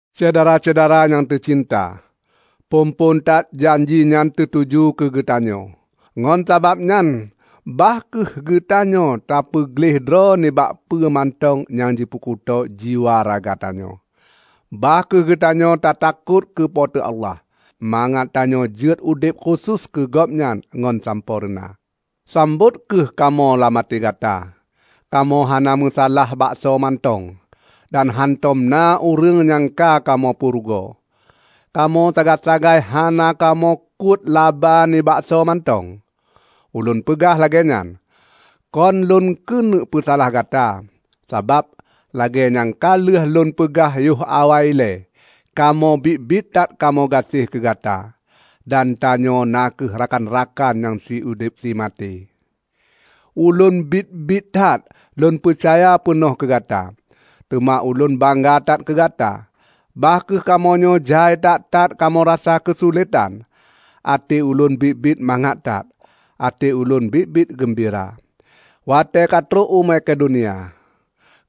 Syedara-syedara nyang teucinta! Phon-phon that janji nyan teutuju keu geutanyoe. Ngon sababnyan bah kheueh geutanyoe tapeugleh droe nibak peue mantong nyang jipeukuto jiwa raga tanyoe. Bah kheueh geutanyoe tatakot keu Po teu Allah, mangat tanyoe jeuet udeb khusos keu Gobnyan ngon sampoereuna. Sambot kheueh kamoe lam até gata. Kamoe hana meusalah baksoe mantong, dan hántom na ureuëng nyang ka kamoe peurugoe. Kamoe sagai-sagai hana kamoe kuet laba nibak soe mantong. Ulôn peugah lagée nyan, kon lôn keuneuk peusalah gata. Sabab, lagée nyang ka lheueh lôn peugah yoh awai ilée, kamoe biet-biet that kamoe gaséh keugata, dan tanyoe na kheueh rakan-rakan nyang siudeb simaté. Ulôn biet-biet that lôn peucaya peunoh keugata. Teuma ulôn bangga that keu gata. Bah kheueh kamoenyoe jai that-that kamoe rasa keusuletan, até ulôn biet-biet mangat that. Até ulôn biet-biet geumbira. Watée katrok u Makedonia,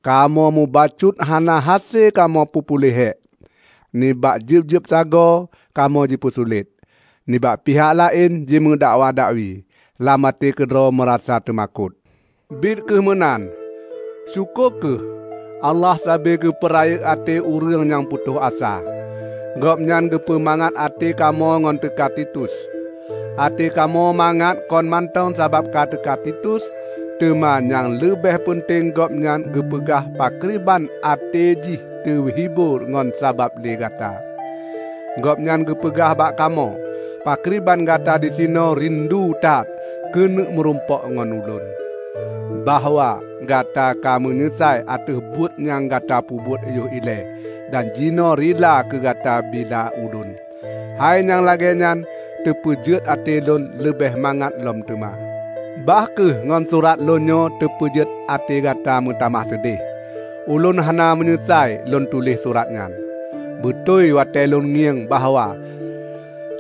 kamoe mubacut hana hase kamoe peupuléh hék. Nibak jeueb-jeueb sagoe kamoe jipeusulét: nibak pihak laén jimeudakwa dakwi, lam até keudroe meurasa teumakot. Biet kheueh meunan, syukoe kheueh, Allah sabe keupeurayeuk até ureuëng nyang putôh asa; Gobnyan geupeumangat até kamoe ngon teuka Titus. Até kamoe mangat kon mantong sabab ka teuka Titus, teuma nyang leubeh peunteng gobnyan geupeugah pakriban até jih teuhibor ngon sabab lé gata. Gobnyan geupeugah bak kamoe pakriban gata disinoe rindu that keuneuk meurumpok ngon ulôn; bahwa gata ka meunyeusai ateueh buet nyang gata peubuet yoh ilée dan jinoe rila keu gata bila ulôn. Hai nyang lagée nyan teupeujeuet até lôn leubeh mangat lom teuma. Bah kheueh ngon surat lôn nyoe teupeujeuet até gata meutamah seudeh, ulôn hana meunyeusai lôn tuléh surat nyan. Beutôi watée lôn ngieng bahwa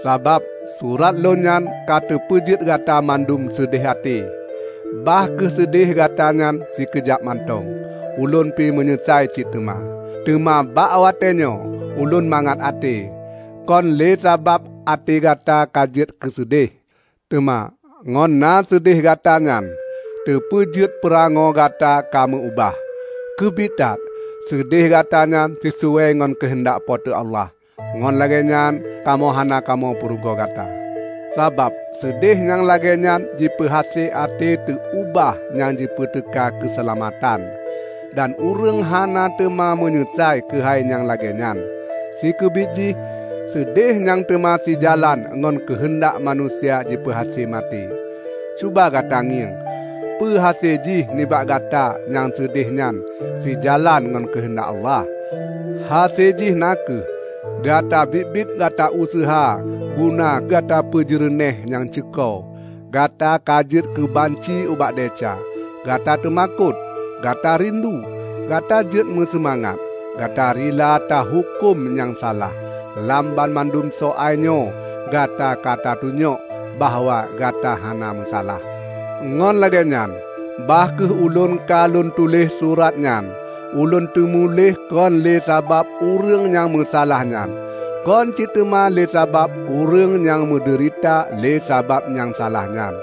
sabab surat lôn nyan ka teupeujeuet gata mandum seudeh até -- bah kheueh seudeh gata nyan sikeujab mantong -- ulôn pi meunyeusai cit teuma. Teuma bak watée nyoe ulôn mangat até -- kon lé sabab até gata ka jeuet keuseudeh, teuma ngon na seudeh gata nyan teupeujeuet peurangoe gata ka meu-ubah. Keubiet that, seudeh gata nyan sisuai ngon keuheundak Po teu Allah. Ngon lagée nyan, kamoe hana kamoe peurugoe gata. Sabab seudeh nyang lagée nyan jipeuhase até teu ubah nyang jipeuteuka keuseulamatan. Dan ureuëng hana teuma meunyeusai keuhai nyang lagée nyan. Sikeubiet jih, seudeh nyang teuma sijalan ngon keuheundak manusia jipeuhase maté. Cuba gata ngieng peuhase jih nibak gata nyang seudeh nyan sijalan ngon keuheundak Allah! Hase jih na kheueh gata biet-biet gata useuha guna gata peujeureunéh nyang ceuko! Gata ka jeuet keubanci ubak desya, gata teumakot, gata rindu, gata jeuet meuseumangat, gata rila tahuköm nyang salah! Lam banmandum soai nyoe gata ka tatunyok bahwa gata hana meusalah. Ngon lagée nyan, bah kheueh ulôn ka lôn tuléh surat nyan, ulôn teumuléh kon lé sabab ureuëng nyang meusalah nyan. Kon cit teuma lé sabab ureuëng nyang meudeurita lé sabab nyang salah nyan.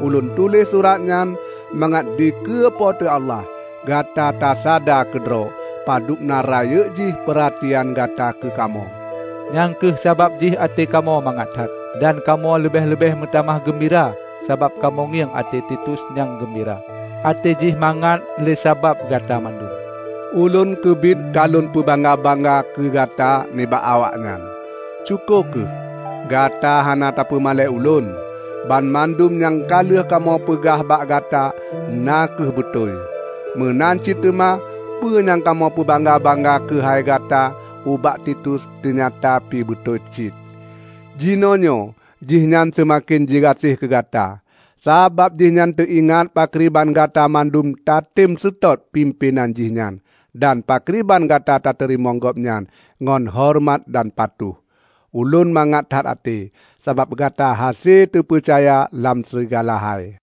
Ulôn tuléh surat nyan mangat dikeue Po teu Allah, gata tasada keudroe padubna rayeuk jih peuratian gata keukamoe. Nyang kheueh sabab jih até kamoe mangat that, dan kamoe leubeh-leubeh meutamah geumbira sabab kamoe ngieng até Titus nyang geumbira; até jih mangat lé sabab Gata banmandum. Ulôn keubiet ka lôn peubangga-bangga keugata nibak awaknyan. Syukoe kheueh, gata hana tapeumalée ulôn. Banmandum nyang ka lheueh kamoe peugah bak gata na kheueh beutôi. Meunan cit teuma peue nyang kamoe peubangga-bangga keuhai gata ubak Titus teunyata pi beutôi cit. Jinoenyoe jihnyan seumaken jigaséh keu gata, sabab jihnyan teuingat pakriban gata mandum tatem seutôt pimpén jihnyan dan pakriban gata teurimong gobnyan ngon horeumat dan patuh. Ulôn mangat that até, sabab gata hase teupeucaya lam sigala hai.